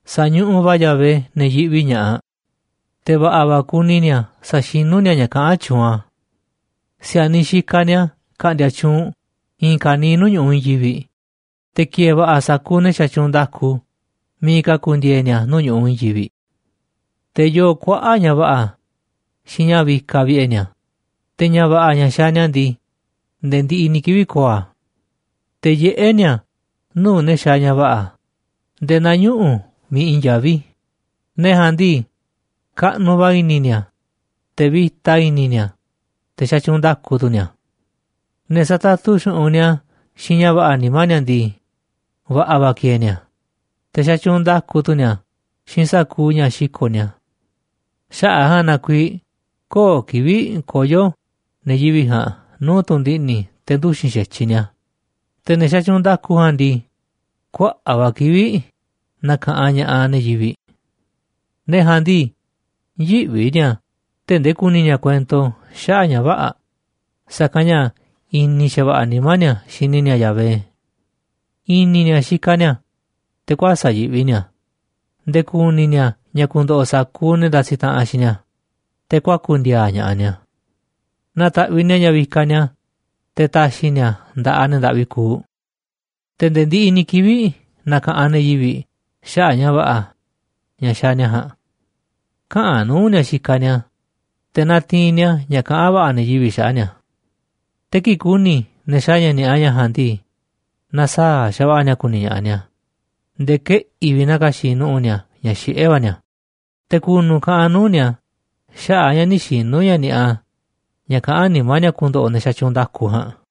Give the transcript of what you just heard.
Sa̱ñuꞌuꞌ va̱ Yahvé ne̱ yiꞌvi ña̱ꞌaꞌ, te̱ va̱ꞌa̱ va̱ kuni ni̱a̱ saxinú ni̱a̱ ña̱ kaꞌán tyuunꞌ a̱. Si̱a̱niꞌ xikaꞌ ni̱a̱ ka̱ꞌndi̱a̱ tyuunꞌ i̱i̱n ka̱niiꞌ nuu̱ꞌ ñu̱ꞌuꞌ i̱i̱n yivi̱ꞌ, te̱ ki̱e̱e̱ va̱ꞌa̱ sa̱kuuꞌ ne̱ xatyuunꞌ nda̱ku miiꞌ ka̱ ku̱ndi̱e̱e̱ ni̱a̱ nuu̱ꞌ ñu̱ꞌuꞌ i̱i̱n yivi̱ꞌ. Te̱ yooꞌ kuaꞌa̱ꞌ ña̱ va̱ꞌa̱ xiinꞌ ña̱ vikaꞌ vi̱ꞌe̱ ni̱a̱, te̱ ña̱ va̱ꞌa̱ ña̱ xaaꞌ ni̱a̱ ndii, nde̱e̱ ndiꞌiꞌ ni̱ kivi̱ꞌ ko̱o̱ a̱. Te̱ yiꞌé ni̱a̱ nuu̱ꞌ ne̱ xaaꞌ ña̱ va̱ꞌa̱ nde̱e̱ naa ñuꞌu̱ miiꞌ i̱i̱n yaví, ne̱ ja̱a̱nꞌ ndii, kaꞌnuꞌ va̱ i̱ni̱ ni̱a̱, te̱ vi̱ta i̱ni̱ ni̱a̱, te̱ xatyuunꞌ nda̱ku tu̱ ni̱a̱. Ne̱ satatu xu̱ꞌunꞌ ni̱a̱ xiinꞌ ña̱ va̱ꞌa̱ nimá ni̱a̱ ndii, va̱ꞌa̱ va̱ kieeꞌ ni̱a̱, te̱ xatyuunꞌ nda̱ku tu̱ ni̱a̱ xiinꞌ sa̱kuuꞌ ña̱ xiko̱ꞌ ni̱a̱. Xaꞌa̱ꞌ a̱ ja̱a̱nꞌ na kuiiꞌ köo̱ꞌ kivi̱ꞌ koyo̱ ne̱ yivi̱ꞌ ja̱a̱nꞌ nuu̱ꞌ tu̱ndiꞌni̱ te̱ nduxi̱n xa̱tyiꞌ ni̱a̱, te̱ ne̱ xatyuunꞌ nda̱ku ja̱a̱nꞌ ndii, kuaꞌa̱ꞌ va̱ kivi̱ꞌ na̱ka̱ꞌanꞌ ña̱ꞌaꞌ ne̱ yivi̱ꞌ. Ne̱ ja̱a̱nꞌ ndii, yïꞌvi ni̱a̱ tee̱ꞌ ndee ku̱ni̱ ni̱a̱ kuento xaꞌa̱ꞌ ña̱ vä̱ꞌa̱, sa̱kanꞌ ña̱ i̱ni̱ xa̱va̱ꞌa̱ nimá ni̱a̱ xini ni̱a̱ Yahvé. I̱ni̱ ni̱a̱ xikaꞌ ni̱a̱, te̱ kuäsa̱ꞌ yiꞌvi ni̱a̱ nde̱e̱ ku̱ni̱ ni̱a̱ ña̱ ku̱ndo̱ꞌo̱ sa̱kuuꞌ ne̱ ndasiꞌ taꞌanꞌ xiinꞌ ni̱a̱, te̱ kuaku̱ ndi̱a̱a̱ ña̱ꞌaꞌ ni̱a̱. Nataꞌviꞌ ni̱a̱ ña̱ vikaꞌ ni̱a̱ te̱ taxiꞌ ni̱a̱ a̱ nda̱ꞌaꞌ ne̱ ndaꞌvi kuuꞌ, te̱ nde̱e̱ ndiꞌiꞌ ni̱ kivi̱ꞌ na̱ka̱ꞌanꞌ ne̱ yivi̱ꞌ xaꞌa̱ꞌ ña̱ va̱ꞌa̱, ña̱ xaaꞌ ni̱a̱ ja̱a̱nꞌ. Käꞌanꞌ nuu̱ꞌ ni̱a̱ xikaꞌ ni̱a̱, te̱ natiinꞌ ni̱a̱ ña̱ kaꞌán va̱ꞌa̱ ne̱ yivi̱ꞌ xaꞌa̱ꞌ ni̱a̱. Te̱ kii̱ꞌ ku̱ni̱ ne̱ xaaꞌ ña̱ ni̱a̱ꞌa ña̱ ja̱a̱nꞌ ndii, na̱saa̱ꞌ xa̱va̱ꞌa̱ ni̱a̱ ku̱ni̱ ña̱ꞌaꞌ ni̱a̱, nde̱e̱ keꞌi̱ꞌ vi̱ꞌ na̱ka̱xi̱ꞌ nu̱ꞌu̱ ni̱a̱ ña̱ xiꞌé va̱ ni̱a̱, te̱ ku̱nu̱ kaꞌanꞌ nuu̱ꞌ ni̱a̱ xaꞌa̱ꞌ ña̱ nï̱ xinu̱ ña̱ ni̱a̱ꞌa ña̱ kaꞌán nimá ni̱a̱ ku̱ndo̱ꞌo̱ ne̱ xatyuunꞌ nda̱ku ja̱a̱nꞌ.